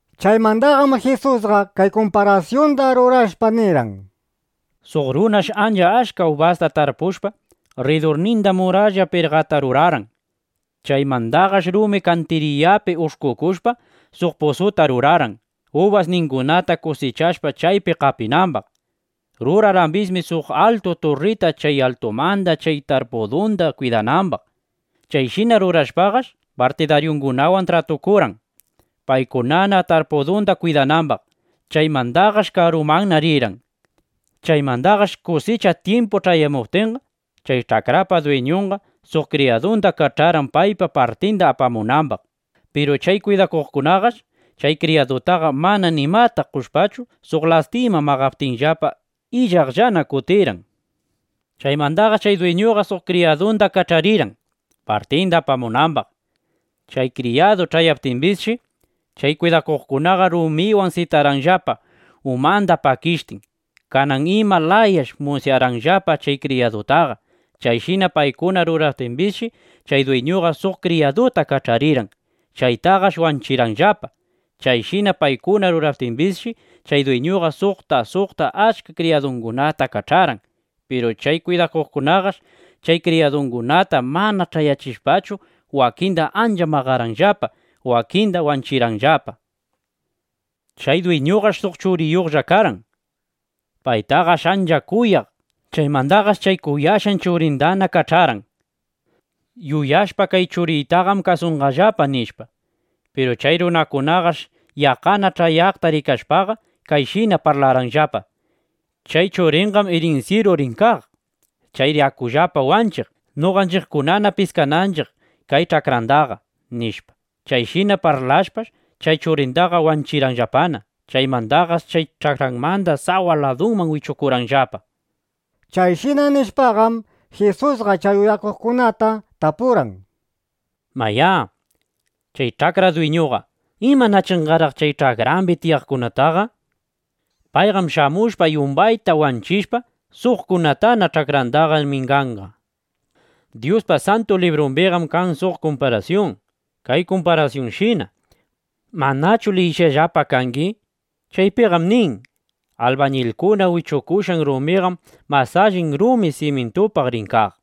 Chaymandaqam Jisusqa kay kumparasyunda rurashpa nirqan: —Suq runash ancha achka ubasta tarpushpa, rridurninda muralla pirqata rurarqan. Chaymandaqash rumi kantiriyapi ush'kukushpa, suq pusuta rurarqan, ubasningunata kusichashpa, chaypi qapinambaq. Rurarqambisshi suq altu turrita, chay altumanda chay tarpudunda kwidanambaq. Chayshina rurashpaqash, partidaryungunawan tratukurqan, paykunana tarpudunda kwidanambaq. Chaymandaqash karumanna rirqan. Chaymandaqash kusicha tyimpu ch'ayamuptinqa, chay ch'akrapa dwiñunqa suq kriyadunda kach'arqan, paypa partinda apamunambaq. Piru chay kwidakuqkunaqash chay kriyadutaqa mana nimata qoshpachu, suq lastima maqaptinllapa, illaqllana kutirqan. Chaymandaqash chay dwiñuqa suq kriyadunda kach'arirqan, partinda apamunambaq. Chay kriyadu ch'ayaptimbisshi, chay kwidakuqkunaqa rumikunawan sitarqanllapa, umanda pakishtin. Kanan ima layash musyarqanllapa chay kriyadutaqa. Chayshina paykuna ruraptimbisshi, chay dwiñuqa suq kriyaduta kach'arirqan. Chaytaqash wanchirqanllapa. Chayshina paykuna ruraptimbisshi, chay dwiñuqa suqta suqta achka kriyadungunata kach'arqan. Piru chay kwidakuqkunaqash chay kriyadukunata mana ch'ayachishpachu, wakinda ancha maqarqanllapa, wakinda wanchirqanllapa. ’Chay dwiñupaqash suq churinlla karqan. Paytaqash ancha kuyaq. Chaymandaqash chay kuyashqan churindana kach'arqan, yuyashpa: Kay churiytaqam kasunqallapa, nishpa. Piru chay runakunaqash yaqqana ch'ayaykaqta rikashpaqa, kayshina parlarqanllapa: “Chay churinqam irinsyiru rin kaq. Chayri akullapa wanchiq, noqanchiqkunana piskananchiq kay ch'akrandaqa”, nishpa. Chayshina parlashpash, chay churindaqa wanchirqanllapana. Chaymandaqash chay ch'akranmanda sawa ladumanna wichukurqanllapa. Chayshina nishpaqam, Jisusqa chay uyakuqkunata tapurqan: —Mayá, chay ch'akra dwiñuqa ¿imanachinqaraq chay ch'akrambi tiyaqkunataqa? Payqam shamushpa, yumbayta wanchishpa, suqkunatana ch'akrandaqa minganqa. Dyuspa Santu Librumbim kan suq kumparasyun kay kumparasyunshina. ¿Manachu liyishqallapa kangi? Chaypiqam nin: Albañilkuna wichukushqan rumiqam mas allin rumi simyintupaq rin kaq.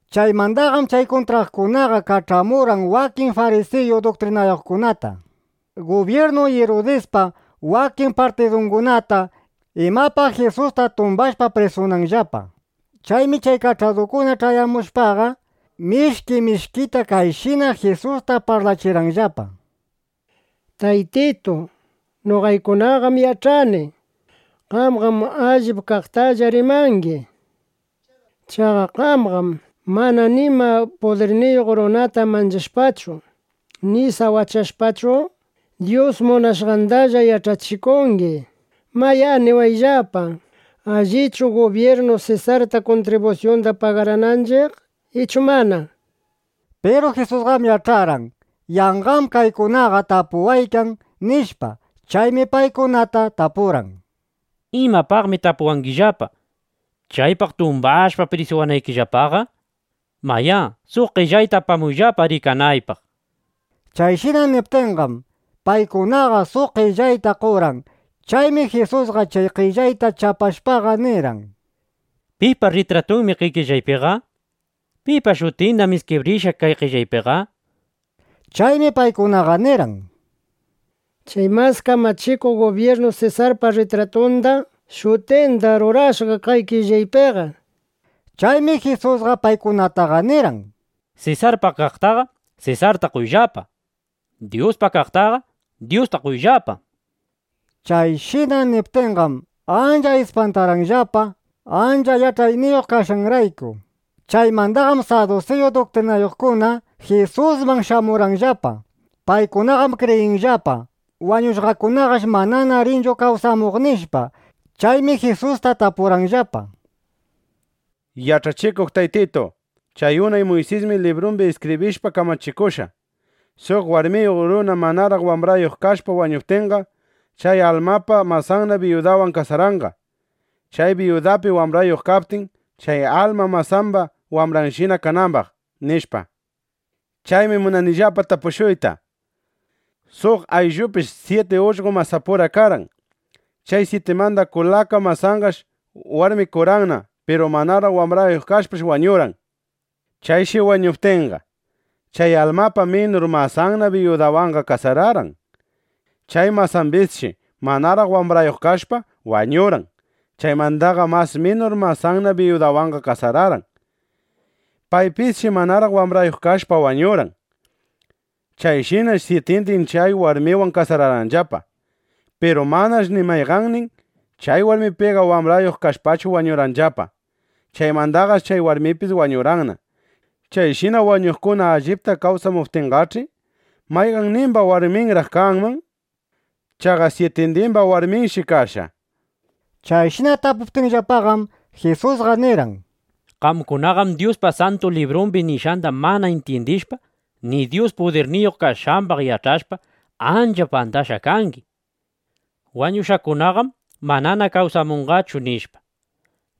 Chaymandaqam chay kuntraqkunaqa kach'amurqan wakin farisiyu duktrinayuqkunata, gubyirnu Irudispa wakin partidungunata, imapaq Jisusta tumbashpa prisunanllapa. Chaymi chay kach'adukuna ch'ayamushpaqa, mishki mishkita kayshina Jisusta parlachirqanllapa: —Taytitu, noqaykunaqam yach'ani: Qamqam allip kaqtalla rimangi. Chaqa qamqam mana nima pudirniyuq runata manchashpachu ni sawachashpachu, Dyus munashqandalla yach'achikungi. Mayá, niwayllapa: ¿Allichu gubyirnu Sesarta kuntribusyunda pagarananchiq, ichu mana? nishpa. Piru Jisusqam yach'arqan: Yanqam kaykunaqa tapuwaykan, nishpa. Chaymi paykunata tapurqan: —¿Imapaqmi tapuwangillapa, chaypaq tumbawashpa, prisuwanaykillapaqa? Mayá, suq qellayta apamuyllapa rikanaypaq, nishpa. Chayshina niptinqam, paykunaqa suq qellayta qorqan. Chaymi Jisusqa chay qellayta chapashpaqa nirqan: —¿Pipa rritratunmi kay qellaypiqa? ¿Pipa shutindam iskibrishqa kay qellaypiqa? nishpa. Chaymi paykunaqa nirqan: —Chay mas kamachikuq gubyirnu Sesarpa rritratunda, shutindam rurashqa kay qellaypiqa, nishpa. Chaymi Jisusqa paykunataqa nirqan: —Sesarpa kaqtaqa, Sesarta qoyllapa. Dyuspa kaqtaqa, Dyustalla qoyllapa. Chayshina niptinqam, ancha ispantarqanllapa, ancha yach'ayniyuq kashqanrayku. Chaymandaqam sadusiyu duktrinayuqkuna Jisusman shamurqanllapa. Paykunaqam kriyinllapa: Wañushqakunaqash manana rinchu kawsamuq, nishpa. Chaymi Jisusta tapurqanllapa: —Yach'achikuq Taytitu, chay unay Muysismi librumbi iskibrishpa kamachikushqa, suq warmiyuq runa manaraq wambrayuq kashpa wañuptinqa, chay almapa masanna biyudawan kasaranqa, chay biyudapi wambrayuq kaptin, chay alma masamba wambranshina kanambaq, nishpa. Chaymi munanillapa tapushuyta: Suq ayllupish syiti ullqo masapura karqan. Chay syitimanda kulaka masanqash warmikurqanna. Piru manaraq wambrayuq kashpash wañurqan. Chayshi wañuptinqa, chay almapa minur masanna biyudawanqa kasararqan. Chay masambisshi manaraq wambrayuq kashpa, wañurqan. Chaymandaqa mas minur masanna biyudawanqa kasararqan. Paypisshi manaraq wambrayuq kashpa, wañurqan. Chayshinash syitindin chay warmiwan kasararqanllapa. Piru manash ni mayqannin chay warmipiqa wambrayuq kashpachu wañurqanllapa. Chaymandaqash chay warmipis wañurqanna. Chayshina wañuqkuna allipta kawsamuptinqach'i, ¿mayqannimba warminraq kanman? Chaqa syitindimba warminshi kashqa, nishpa. Chayshina tapuptinllapaqam, Jisusqa nirqan: —Qamkunaqam Dyuspa Santu Librun nishqanda mana intyindishpa, ni Dyus pudirniyuq kashqambaq yach'ashpa, ancha pandashqa kangi: (Wañushqakunaqam mana kawsamunqachu, nishpa).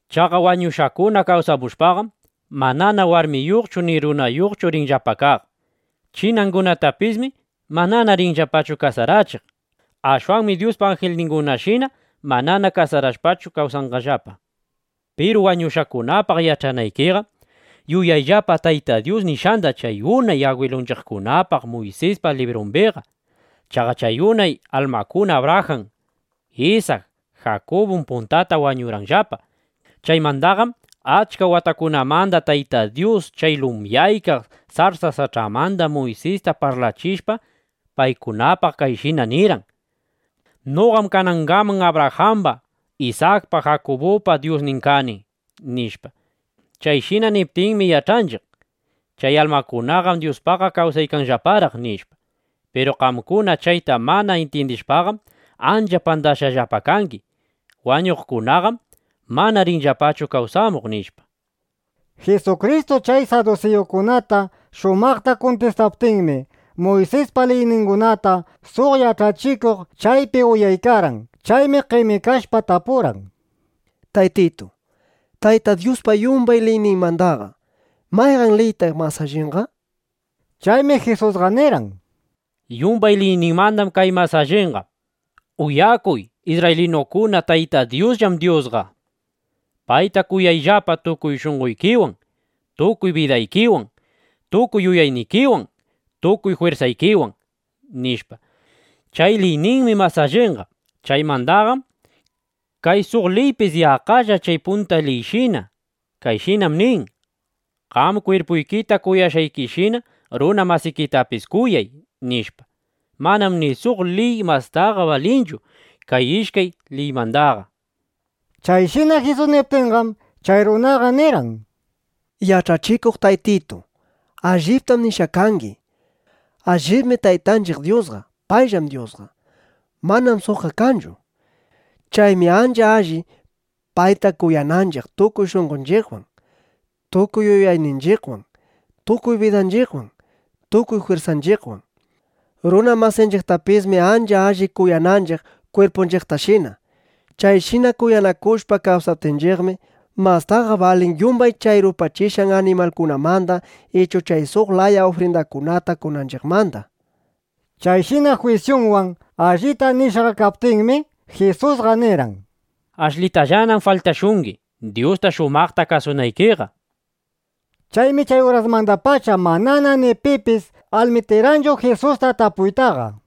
Chaqa wañushqakuna kawsamushpaqam, manana warmiyuqchu ni runayuqchu rinllapa kaq. Chinangunatapismi manana rinllapachu kasarachiq. Ashwanmi Dyuspa anjilningunashina manana kasarashpachu kawsanqallapa. Piru wañushqakunapaq yach'anaykiqa, yuyayllapa Tayta Dyus nishqanda chay unay agwilunchiqkunapaq Muysispa librumbiqa. Chaqa chay unay almakuna Abrajan, Isak, Jakubum puntata wañurqanllapa. Chaymandaqam achka watakunamanda Tayta Dyus chay lumyaykaq sarsa sach'amanda Muysista parlachishpa, paykunapaq kayshina nirqan: “Noqam kanangaman Abrajamba, Isakpa, Jakubupa Dyusnin kani”, nishpa. Chayshina niptinmi yach'anchiq: Chay almakunaqam Dyuspaqqa kawsaykanllaparaq, nishpa. Piru qamkuna chayta mana intyindishpaqam, ancha pandashqallapa kangi: Wañushqakunaqam mana rinllapachu kawsamuq, nishpa. Jisukristu chay sadusiyukunata shumaqta kuntistaptinmi, Muysispa liyningunata suq yach'achikuq chaypi uyaykarqan. Chaymi qemikashpa tapurqan: —Taytitu, Tayta Dyuspa yumbay liyninmandaqa, ¿mayqan liytaq mas allinqa? nishpa. Chaymi Jisusqa nirqan: —Yumbay liyninmandam kay mas allinqa: “Uyakuy isrraylinukuna, Tayta Dyusllam Dyusqa. Payta kuyayllapa tukuy shunqoykiwan, tukuy bidaykiwan, tukuy yuyaynikiwan, tukuy jwirsaykiwan”, nishpa. Chay liyninmi mas allinqa. Chaymandaqam kay suq liypis yaqqalla chay punta liyshina. Kayshinam nin: “Qam kwirpuykita kuyashqaykishina runa masikitapis kuyay”, nishpa. Manam ni suq liy mastaqa balinchu kay ishkay liymandaqa. Chayshina Jisus niptinqam, chay runaqa nirqan: —Yach'achikuq Taytitu, alliptam nishqa kangi. Allibmi Taytanchiq Dyusqa payllam Dyusqa. Manam suqqa kanchu. Chaymi ancha alli, payta kuyananchiq tukuy shunqonchiqwan, tukuy yuyayninchiqwan, tukuy bidanchiqwan, tukuy jwirsanchiqwan. Runa masinchiqtapismi ancha alli kuyananchiq kwirpunchiqtashina. Chayshina kuyanakushpa kawsaptinchiqmi, mastaqa balin yumbay chay rupachishqan animalkunamanda ichu chay suq laya ufrindakunata qonanchiqmanda. Chayshina jwisyunwan allita nishqa kaptinmi, Jisusqa nirqan: —Ashlitallanam faltashungi, Dyusta shumaqta kasunaykiqa, nishpa. Chaymi chay urasmandapacha manana ni pipis almitikarqanchu Jisusta tapuytaqa.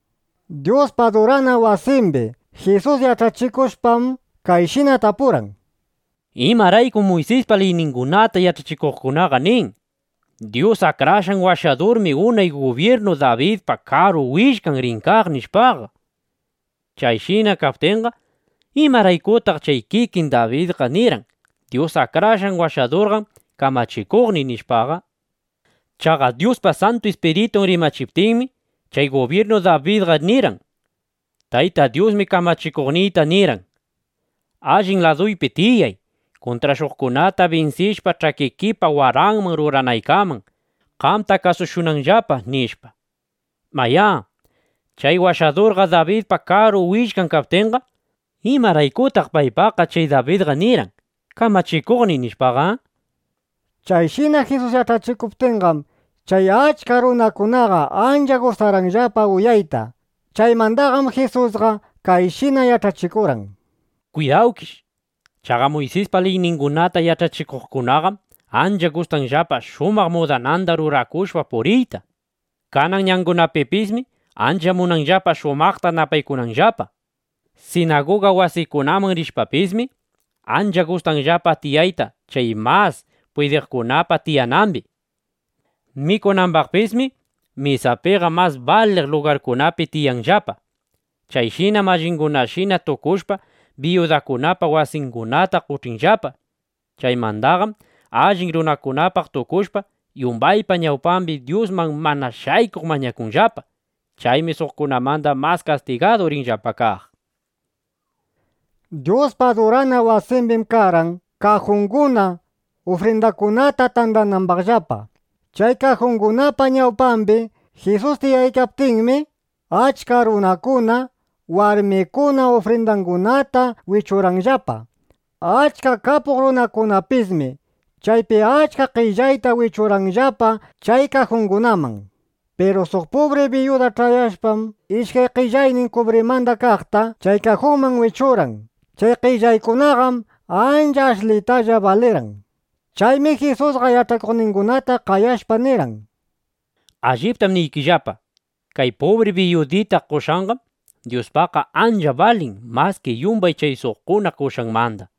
Dyuspa adurana wasimbi Jisus yach'achikushpam, kayshina tapurqan: —¿Imaraykum Muysispa liyningunata yach'achikuqkunaqa nin: “Dyus Akrashqan Washadurmi unay gubyirnu Dabidpa karu willkan rin kaq” nishpaqa? (Chayshina kaptinqa, ¿imaraykutaq chay kikin Dabidqa nirqan: “Dyus Akrashqan Washadurqam kamachikuqniy”, nishpa?) Chaqa Dyuspa Santu Ispiritun rimachiptinmi, chay gubyirnu Dabidqa nirqan: Tayta Dyusmi Kamachikuqniyta nirqan: “Allin laduypi tiyay, kuntrashuqkunata binsishpa, ch'akikipa waranman ruranaykaman (qamta kasushunanllapa)”, nishpa. Mayá, chay Washadurqa Dabidpa karu willkan kaptinqa, ¿imaraykutaq paypaqqa chay Dabidqa nirqan: “Kamachikuqniy” nishpaqa? Chayshina Jisus yach'achikuptinqam, chay achka runakunaqa ancha gustarqanllapa uyayta. Chaymandaqam Jisusqa kayshina yach'achikurqan: —Kwidawkish. Chaqa Muysispa liyningunata yach'achikuqkunaqam ancha gustanllapa shumaq mudananda rurakushpa puriyta. Kanan ñangunapipismi ancha munanllapa shumaqta napaykunanllapa. Sinaguga wasikunaman rishpapismi, ancha gustanllapa tiyayta chay mas pwidiqkunapa tiyanambi. Mikunambaqpismi mesapiqa mas baliq lugarkunapi tiyanllapa. Chayshinam allingunashina tukushpa, biyudakunapa wasingunata qoch'inllapa. Chaymandaqam allin runakunapaq tukushpa, yumbaypa ñawpambi Dyusman mana shaykuq mañakunllapa. Chaymi suqkunamanda mas kastigadu rinllapa kaq. Dyuspa adurana wasimbim karqan kajunguna, ufrindakunata tandanambaqllapa. Chay kajungunapa ñawpambi Jisus tiyaykaptinmi, achka runakuna, warmikuna ufrindangunata wichuqllapa. Achka kapuq runakunapismi chaypi achka qellayta wichuqllapa chay kajungunaman. Piru suq pubri biyuda ch'ayashpam, ishkay qellitaynin kubrimanda kaqta chay kajunman wichurqan. Chay qellitaykunaqam ancha ashlitalla balirqan. Chaymi Jisusqa yach'akuqningunata qayashpa nirqan: —Alliptam niykillapa, kay pubri biyudita qoshqanqam Dyuspaqqa ancha balin maski yumbay chay suqkuna qoshqanmanda.